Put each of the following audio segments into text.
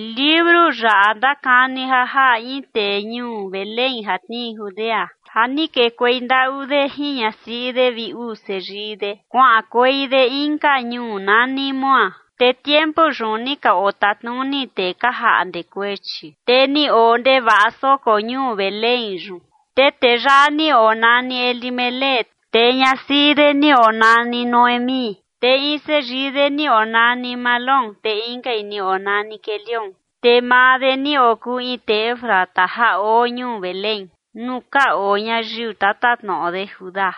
Liuru yaꞌa ndakani ja jaꞌa in tee ñuu Belén ja tnii Judea ja ni kekuei ndaꞌu de jin ñasiꞌi de vi uu seyii de kuaꞌankuei de inka ñuu nani Moab. Te tiempu yun ni ka otatnuni tee ka jaꞌnde kuechi, te ni oo ndevaꞌa soko ñuu Belén yun. Te tee yaꞌa ni onani Elimelec, te ñasiꞌi de ni onani Noemí, te in seyii de ni onani Mahlón, te inkai ni onani Quelión. Te maa de ni okuu in tee Efrata ja oo ñuu Belén nuu ka oo ñayiu tatatnoꞌo de Judá.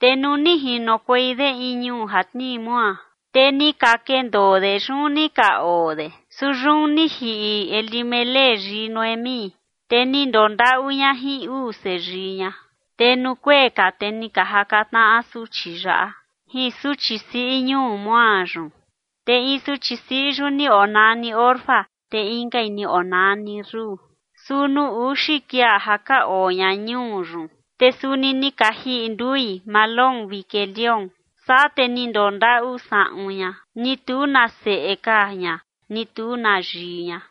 Te nuu ni jinokuei de in ñuu ja tnii Moab, te ni ka kendoo de, yun ni ka oo de. Su yun ni jiꞌi Elimelec yii Noemí, te ni ndondaꞌu ña jin uu seyii ña. Te nuu kuee ka, te ni ka jaka tnaꞌa suchi yaꞌa jin suchi siꞌi ñuu Moab yun. Te in suchi siꞌi yun ni onani Orfa, te inkai ni onani Rut. Su nuu uxi kuia ja ka oo ña ñuu yun, te suni ni ka jiꞌi ndui Mahlón vi Quelión. Saa te ni ndondaꞌu saꞌun ña, ni tu na seꞌe ka ña ni tu na yii ña.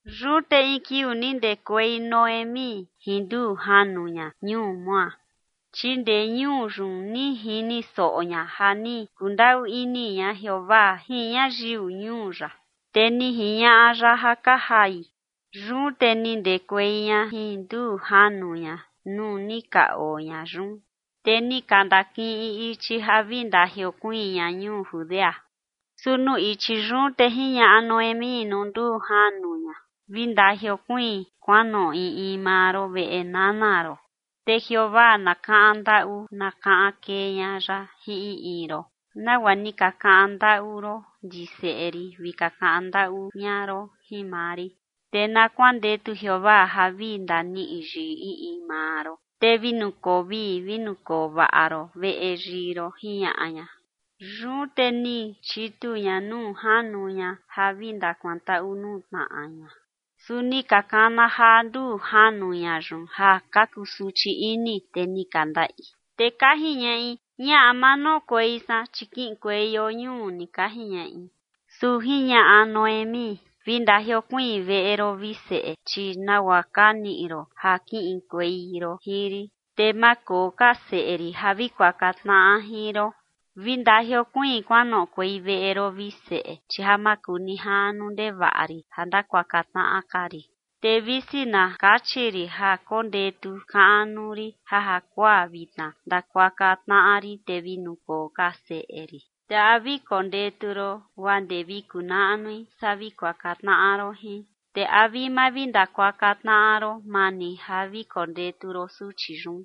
Yun te in kiuu ni ndekuei Noemí jin nduu janu ña ñuu Moab, chi ndee ñuu yun ni jini soꞌo ña ja ni kundaꞌu ini ña Jeovaa jin ñayiu ñuu ya, te ni jiñaꞌa ya ja ka jai. Yun te ni ndekuei ña jin nduu janu ña nuu ni ka oo ña yun, te ni ka ndakiꞌin ichi ja vi ndajiokuiin ña ñuu Judea. Su nuu ichi yun te jiñaꞌa Noemí nuu nduu janu ña: ―Vi ndajiokuiin kuanoꞌo in in maa ron veꞌe nana ron, te Jeovaa na kaꞌan ndaꞌu na kaꞌan kee ña ya jin in in ron, nagua ni ka kaꞌan ndaꞌu ron ndi seꞌe rin vi ka kaꞌan ndaꞌu ña ron jin maa rin. Te na kuandetu Jeovaa ja vi ndaniꞌi yii in in maa ron, te vi nukoo vii vi nukoo vaꞌa ron veꞌe yii ron ―jiñaꞌa ña. Yun te ni chitu ña nuu janu ña ja vi ndakuantaꞌu nuu tnaꞌa ña. Su ni ka kana jaa nduu janu ña yun ja ka kusuchi ini, te ni ka ndaꞌi. Te ka jiñaꞌi: ―Ñaꞌa, ma noꞌokuei san, chi kiꞌinkueio ñuu ni ―ka jiñaꞌi. Su jiñaꞌa Noemí: ―Vi ndajiokuiin veꞌe ron, vi seꞌe, chi nagua ka niꞌi ron ja kiꞌinkuei ron jin rin, te ma koo ka seꞌe rin ja vi kuaka tnaꞌa jin ron. Vi ndajiokuiin kuanoꞌokuei veꞌe ron, vi seꞌe, chi ja makunijaꞌnu ndevaꞌa rin ja ndakuaka tnaꞌa ka rin. Te visi na kachi rin ja kondetu kaꞌnu rin ja jakuaa vitna ndakuaka tnaꞌa rin te vi nukoo ka seꞌe rin, ¿te a vi kondetu ron guaa ndee vi kunaꞌnui saa vi kuaka tnaꞌa ron jin? ¿Te a vi mavindakuaka tnaꞌa ron, maa ni ja vi kondetu ron suchi yun?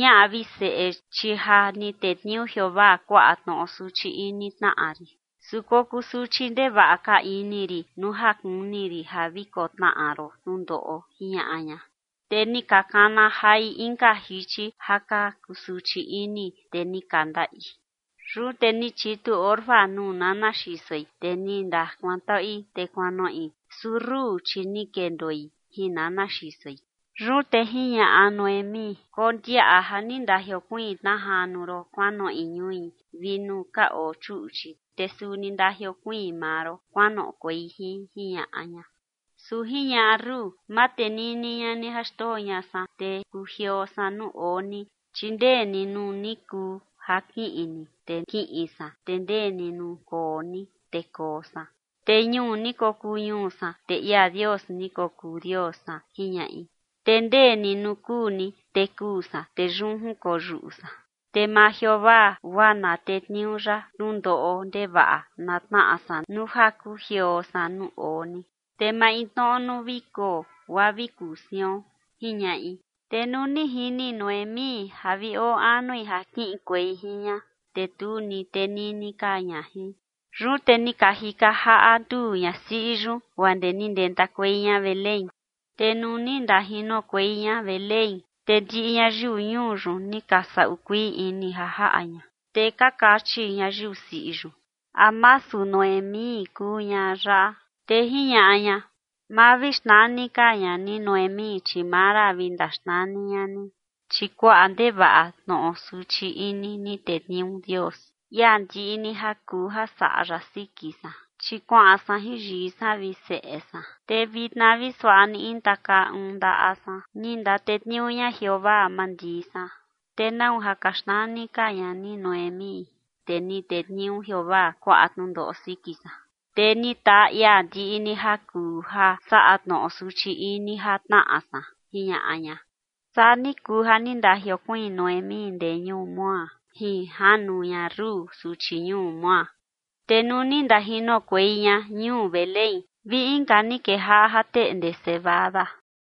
Ñaꞌa, vi seꞌe, chi ja ni tetniuu Jeovaa kuaꞌa tnoꞌo suchi ini tnaꞌa rin, su kokuu suchi ndevaꞌa ka ini rin nuu ja kuni rin ja vi kotnaꞌa ron tnundoꞌo ―jiñaꞌa ña. Te ni ka kana jai inka jichi ja ka kusuchi ini, te ni ka ndaꞌi. Yun te ni chitu Orfa nuu nana xisoi, te ni ndakuantaꞌui te kuanoꞌi, su Rut, chi ni kendoi jin nana xisoi. Yun te jiñaꞌa Noemí: ―Kondiaꞌa ja ni ndajiokuiin tna janu ron kuanoꞌi ñui vi nuu ka oo chuꞌchi. Te suni ndajiokuiin maa ron kuanoꞌokuei jin ―jiñaꞌa ña. Su jiñaꞌa Rut: ―Ma tenini ña ni ja xndoo ña san, te kujioo san nuu oo ni, chi ndee ni nuu ni kuu ja kiꞌin ni, te kiꞌin san, te ndee ni nuu koo ni, te koo san. Te ñuu ni kokuu ñuu san, te ia Dios ni kokuu Dios san ―jiñaꞌi―. Te ndee ni nuu kuu ni, te kuu san, te yun jinkoyuꞌu san. Te maa Jeovaa guaa na tetniuu ya tnundoꞌo ndevaꞌa na tnaꞌa san nuu ja kujioo san nuu oo ni, te maintnoꞌo nuu vi kuo guaa vi kuu sion ―jiñaꞌi. Te nuu ni jini Noemí ja vi oo anui ja kiꞌinkuei jin ña, te tu ni tenini ka ña jin. Yun te ni ka jika jaꞌa nduu ñasiꞌi yun guaa ndee ni ndentakuei ña Belén. Te nuu ni ndajinokuei ña Belén, te ndiꞌi ñayiu ñuu yun ni ka saꞌu kuii ini ja jaꞌa ña, te ka kachi ñayiu siꞌi yun: ―¿A masu Noemí kuu ñaꞌa yaꞌa? Te jiñaꞌa ña: ―Ma vi xnani ka ña ni Noemí, chi Mara vi ndaxnani ña ni, chi kuaꞌa ndevaꞌa tnoꞌo suchi ini ni tetniuu Dios, ia ndiꞌi ni ja kuu ja saꞌa ya, siki san. Chi kuaꞌan san jin yii san vi seꞌe san, te vitna vi suaꞌa ni intakaa uun ni ndaꞌa san ni ndatetniuu ña Jeovaa mandii san. ¿Te nau ja ka xnani ka ña ni Noemí, te ni tetniuu Jeovaa kuaꞌa tnundoꞌo siki san, te ni taa ia ndiꞌi ni ja kuu ja saꞌa tnoꞌo suchi ini ja tnaꞌa san? ―jiñaꞌa ña. Saa ni kuu ja ni ka ndajiokuiin Noemí ndee ñuu Moab jin janu ña Rut, suchi ñuu Moab. Te nuu ni ndajinokuei ña ñuu Belén vi inka ni kejaꞌa ja teꞌnde cebada.